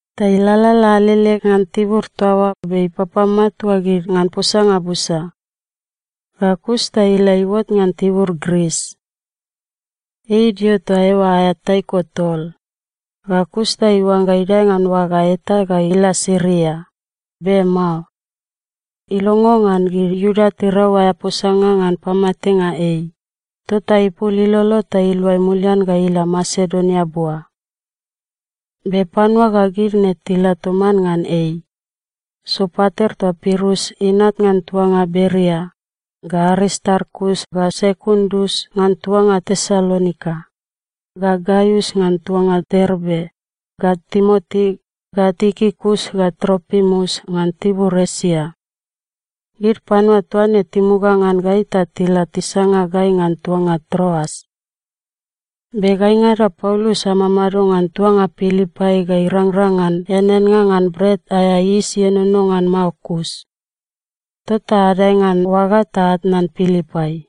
Ta ilalala alele ngan tibur toa oa be ipapamatua gid ngan posanga busa. Ga kus ta ila iuot ngan tibur Gris. Ei idio toa eoa aea taiko tol. Ga kus ta iuangga idae ngan oaga eta ga ila Siria, be mao. Ilongo ngan gid Iuda tirau aea posanga ngan pamatenga ei, tota ipul ilolo ta iluai mulian ga ila Masedonia bua. Be panua ga gid ne tila toman ngan ei: Sopater toa Pirus inat ngan tuanga Beria, ga Aristarkus ga Sekundus ngan tuanga Tesalonika, ga Gaius ngan tuanga Derbe, ga Timoti, ga Tikikus ga Tropimus ngan tibur Esia. Gid panua toa ne timuga ngan gai ta tila tisanga gai ngan tuanga Troas. Be gaingada Paulus amamado ngan tuanga Pilipai ga irangrang ngan eaneannga ngan Bret aea Yis Ienono ngan Mao kus. Tota adae ngan oaga ta atnan Pilipai.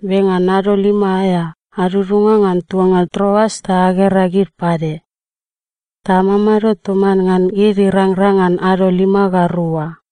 Be ngan ado lima aea, adudunga ngan tuanga Troas ta agera gid pade. Ta amamado toman ngan gid irangrang ngan ado lima ga rua.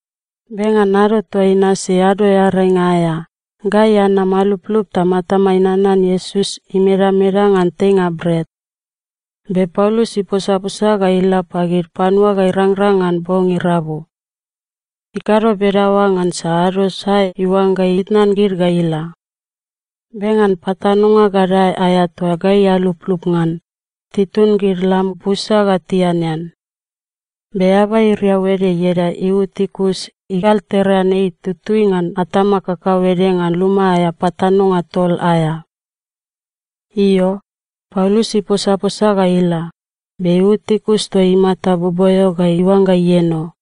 Be ngan ado toa inasi Ado Earainga aea, gai anam aluplup ta matamai nanan Iesus imedameda ngan teinga bret. Be Paulus iposaposa ga ila pagid panua ga irangrang ngan bong irabu. Ikado bedaoa ngansa ado sae iuangga itnan gid ga ila. Be ngan patanonga gadae aea toa gai aluplup ngan, titun gid lam busa ga tianean. Be eaba iriau ede ieda Iutikus igalterean ei tutui ngan atama kakauede ngan luma aea patanonga tol aea. Io, Paulus iposaposa ga ila, be Iutikus toa imata boboeo ga iuangga ieno.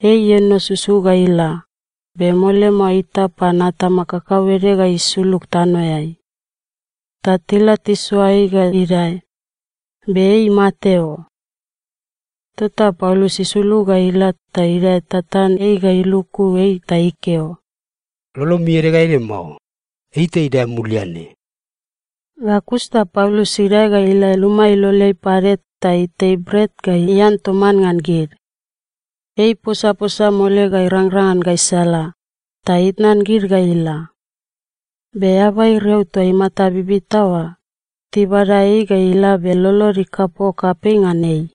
Ei ieno susu ga ila, be mole mao itap pan atama kakauede ga isulug tanoeai. Ta tila tisoa ei ga idae, be ei imate o. Tota Paulus isulug ga ila ta idae tatan ei ga iluku ei ta ikeo, “Lolomi ede ga ede mao. Ei ta idae mulian ne.” Ga kus ta Paulus idae ga ila luma iloleai pade ta itei bret ga ian toman ngan gid. Ei iposaposa mole ga irangrang ngan gaisala, ta itnan gid ga ila. Be eaba iriau toa imata bibita oa, tibada ei ga ila be lolod ikapok kapei ngan ei.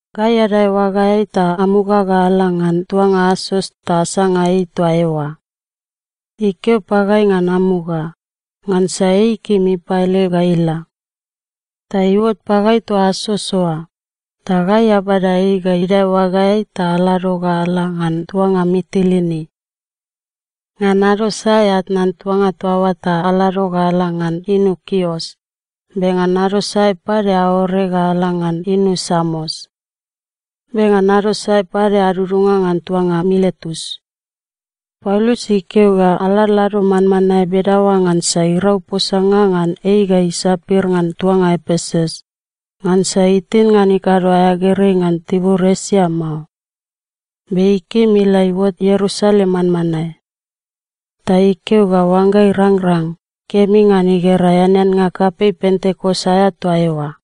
Gai adae oagaeai ta amuga ga ala ngan tuanga Asos ta asanga ei toa eoa. Ikeo pagai ngan amuga, ngansa ei ikim ipaele ga ila. Ta iuot pagai toa Asos oa, ta gai abada ei ga idae oagaeai ta alado ga ala ngan tuanga Mitilini. Ngan ado sae atnan tuanga toa oa ta alado ga ala ngan inu Kios, be ngan ado sae pade aore ga ala ngan inu Samos. Be ngan ado sae pade adudunga ngan tuanga Miletus. Paulus ikeo ga aladlado manmanae bedaoa ngansa irau posanga ngan ei ga isapir ngan tuanga Epesus, ngansa itin ngan ikado aea gerei ngan tibur Esia mao. Be ikim ila iuot Ierusalem manmanae. Ta ikeo ga oangga irangrang, kemi ngan igera eaneannga kapei Pentekos aea toa eoa.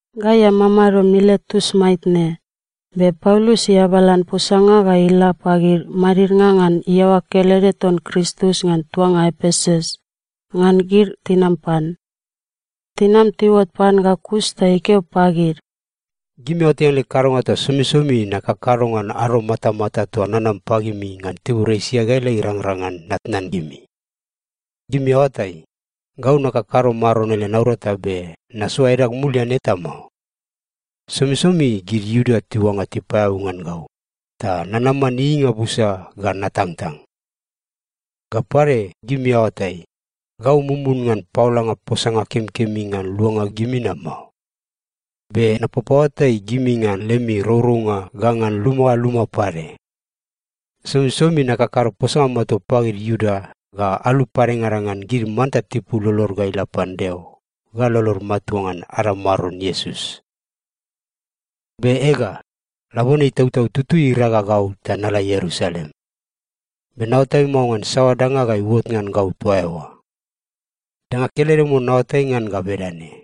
Gai amamado Miletus maitne, be Paulus iabalan posanga ga ila pagid madidnga ngan iaoa kelede ton Kristus ngan tuanga Epesus, ngan gid tinam pan. Tinam tiuot pan ga kus ta ikeo pagid, “Gimi aoatai ngan leg kadonga toa somisomi nakakado ngan ado matamata toa nanam pagimi ngan tibur Esia ga ila irangrang ngan natnan gimi. Gimi aoatai, gau nakakado Maron ele naurata be nasoa edag mulian eta mao. Somisomi gid Iuda tiuangga tipaeabu ngan gau, ta nanaman ieieinga busa ga natangtang. Ga pade, gimi aoatai, gau mumun ngan paolanga posanga kemikemi ngan luanga gimi na mao. Be napapaoatai gimi ngan lemi rourounga ga ngan luma ga luma pade. Somisomi nakakado posanga matua pagid Iuda ga alu padengada ngan gid manta tipul lolod ga ila pan Deo ga lolod matua ngan ada Maron Iesus. “Be ega, labone Itautau Tutui iraga gau ta nala Ierusalem. Be naoatai mao ngan saoa danga ga iuot ngan gau toa eoa. Danga kelede mon naoatai ngan ga bedane: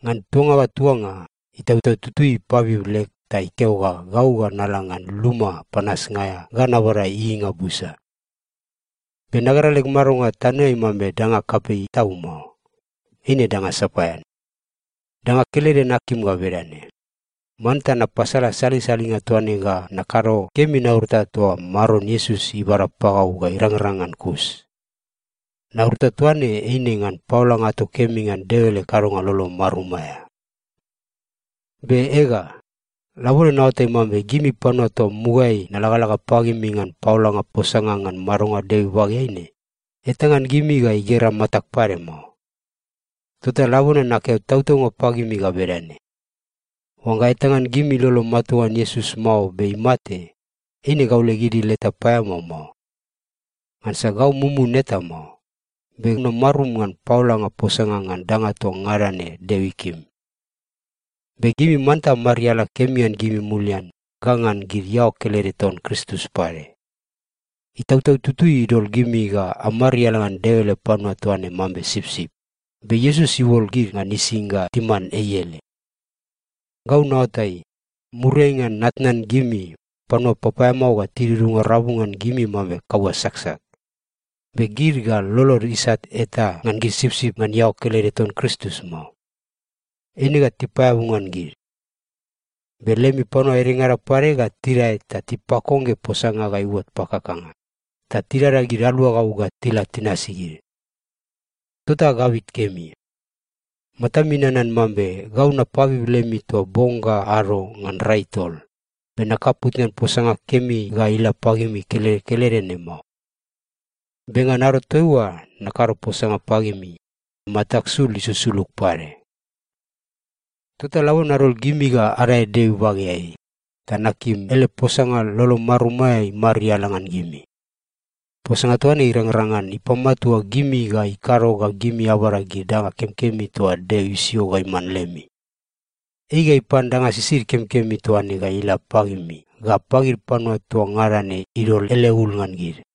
Ngan tuanga ga tuanga, Itautau Tutui ipabib leg ta ikeo ga gau ga nala ngan luma panasnga aea ga nabada ieieinga busa. Be nagera leg madonga tanoeai mambe danga kapei tau mao. Eine danga sapaean. Danga kelede nakim ga bedane: Manta napasala salisalinga toa ne ga nakado kemi naurata toa Maron Iesus ibada pagau ga irangrang ngan kus. Naurata toa ne eine ngan paolanga ato kemi ngan Deo ele kadonga lolo marum aea. “Be ega, labone naoatai mambe gimi panua toa mugaeai nalagalaga pagimi ngan paolanga posanga ngan madonga Deo ibageai ne, eta ngan gimi ga igera matag pade mao. Tota labone nakeo tautaunga pagimi ga bedane: Oangga eta ngan gimi ilolo matua ngan Iesus mao be imate, eine gau leg idil eta paeamao mao. Ngansa gau mumun eta mao, be namarum ngan paolanga posanga ngan danga toa ngada ne Deo ikim. Be gimi manta amariala kemi ngan gimi mulian ga ngan gid iaoa kelede ton Kristus pade. Itautau Tutui idol gimi ga amariala ngan Deo ele panua toa ne mambe sipsip, be Iesus iuol gid ngan ising ga timan ei ele. Gau naoatai, muriai ngan natnan gimi, panua papaeamao ga tidudunga rabu ngan gimi mambe kaua saksak, be gid ga lolod isat eta ngan gid sipsip ngan iaoa kelede ton Kristus mao. Eine ga tipaeabu ngan gid. Be lemi panua edengada pade ga tidae ta tipakongge posanga ga iuot pakakanga, ta tidada gid aluagau ga tila tinasi gid. Tota agabit kemi. Matami nanan mambe gau napabib lemi toa bong ga ado ngan rai tol, be nakaput ngan posanga kemi ga ila pagimi kelede kelede ne mao. Be ngan ado toaiua nakado posanga pagimi, matag sul isusulug pade. “Tota labone nadol gimi ga adae Deo ibageai, ta nakim ele posanga lolo marum aea imariala ngan gimi. Posanga toa ne irangrang ngan ipamatua gimi ga ikado ga gimi abada gid danga kemikemi toa Deo isio ga iman lemi. Ei ga ipan danga sisid kemikemi toa ne ga ila pagimi ga pagid panua toa ngada ne idol ele ul ngan gid.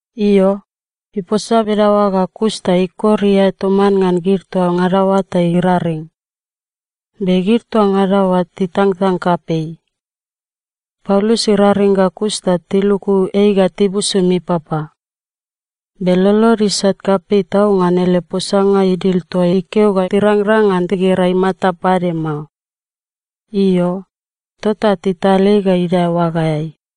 Io, iposa bedaoa ga kus ta ikor iae toman ngan gid toa ngada oa ta iraring. Be gid toa ngada oa titangtang kapei. Paulus iraring ga kus ta tiluku ei ga tibusum ipapa. Be lolod isat kapei tau ngan ele posanga idil toa ikeo ga tirangrang ngan tigera imata pade mao. Io, tota tital ei ga idae oagaeai.